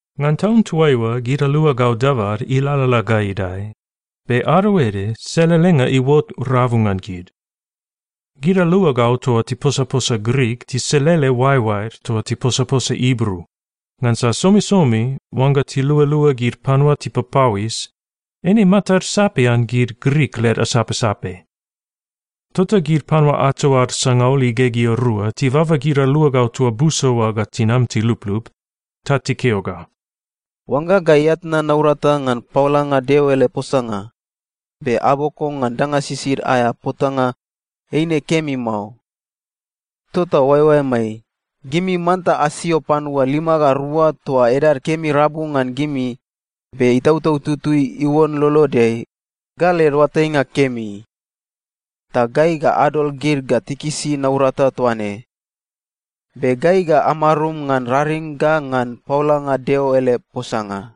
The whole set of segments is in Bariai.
Ngan taun toaiua gid aluagau dabad ilalala ga idae, be ado ede selelenga iuot rabu ngan gid. Gid aluagau toa tiposaposa Grik tiselele oaeoaed toa tiposaposa Ibru, ngansa somisomi oangga tilualua gid panua tipapauis, eine matad sapian gid Grik led asapsape. Tota gid panua ato ad sangaul igegea rua tibaba gid aluagau toa busa oa ga tinam tiluplup, ta tikeo ga, “Oangga gai atnan naurata ngan paolanga Deo ele posanga, be aboko ngan danga sisid aea potanga, eine kemi mao. Tota oaeoaemai, gimi manta asio panua lima ga rua toa edad kemi rabu ngan gimi, be Itautau Tutui iuon lolodeai, ga led oatainga kemi. Ta gai ga adol gid ga tikisi naurata toa ne. Be gai ga amarum ngan raring ga ngan paolanga Deo ele posanga.”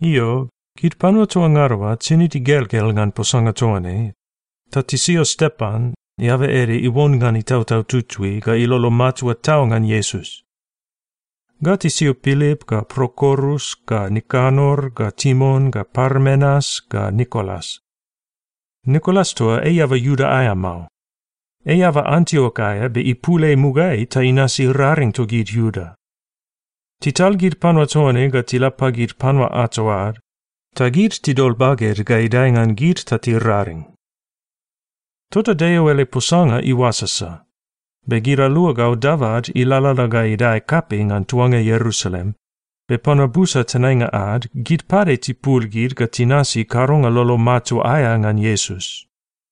Io, gid panua toa ngada oa tinid igelgel ngan posanga toa ne, ta tisio Stepan, eaba ede iuon ngan Itautau Tutui ga ilolo matua tau ngan Iesus. Ga tisio Pilip ga Prokorus ga Nikanor ga Timon ga Parmenas ga Nikolas. Nikolas toa ei eaba Iuda aea mao. Ei eaba Antiok aea be ipul ei mugaeai ta inasi raring togid Iuda. Tital gid panua toa ne ga tila pagid panua ato ad, ta gid tidol baged ga idae ngan gid ta tiraring. Tota Deo ele posanga iuasasa, be gid aluagau dabad ilalala ga idae kapei ngan tuanga Ierusalem, be panua busa tenainga ad, gid pade tipul gid ga tinasi kadonga lolo matua aea ngan Iesus.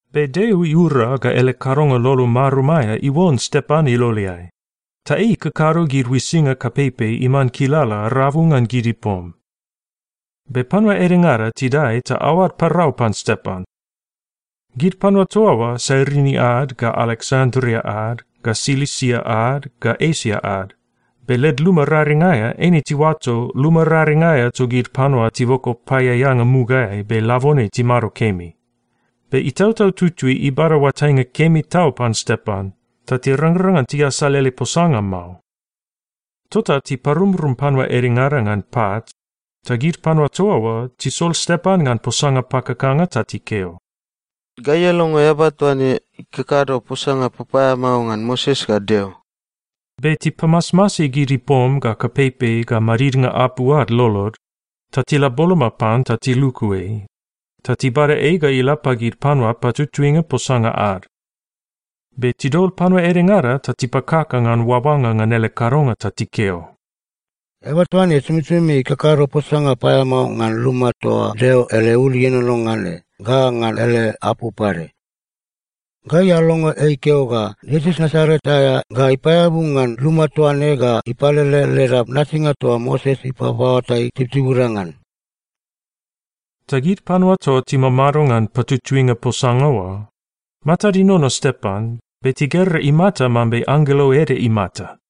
Be Deo iura ga ele kadonga lolo marum aea iuon Stepan iloleai, ta ei ikakado gid uisinga kapeipei iman kilala rabu ngan gid ipom. Be panua edengada tidae ta aoad parau pan Stepan. Gid panua toa oa Sairini ad, ga Aleksandria ad, ga Silisia ad, ga Esia ad, be led luma raring aea, eine tiuato luma raring aea togid panua tiboko paeaeanga mugaeai be labone timado kemi. Be Itautau Tutui ibada oatainga kemi tau pan Stepan, ta tirangrang ngan tiasal ele posanga mao. Tota tiparumrum panua edengada ngan pat, ta gid panua toa oa tisol Stepan ngan posanga pakakanga ta tikeo, “Gai alongo eaba toa ne ikakado posanga papaeamao ngan Moses ga Deo!” Be tipamasmasi gid ipom ga kapeipei ga madidnga apu ad lolod, ta tila boloma pan ta tiluku ei, ta tibada ei ga ila pagid panua patutuinga posanga ad. Be tidol panua edengada ta tipakaka ngan oaoanga ngan ele kadonga ta tikeo, “Eaba toa ne somisomi ikakado posanga paeamao ngan luma toa Deo ele ul ienono ngan ne ga ngan ele apu pade. Gai alongo ei ikeo ga Iesus Nasaret aea ga ipaeabu ngan luma toa ne ga ipalele leda nasinga toa Moses ipaoatai tibutibuda ngan.” Ta gid panua toa timamado ngan patutuinga posanga oa, matad inono Stepan, be tigera imata mambe anggelo ede imata.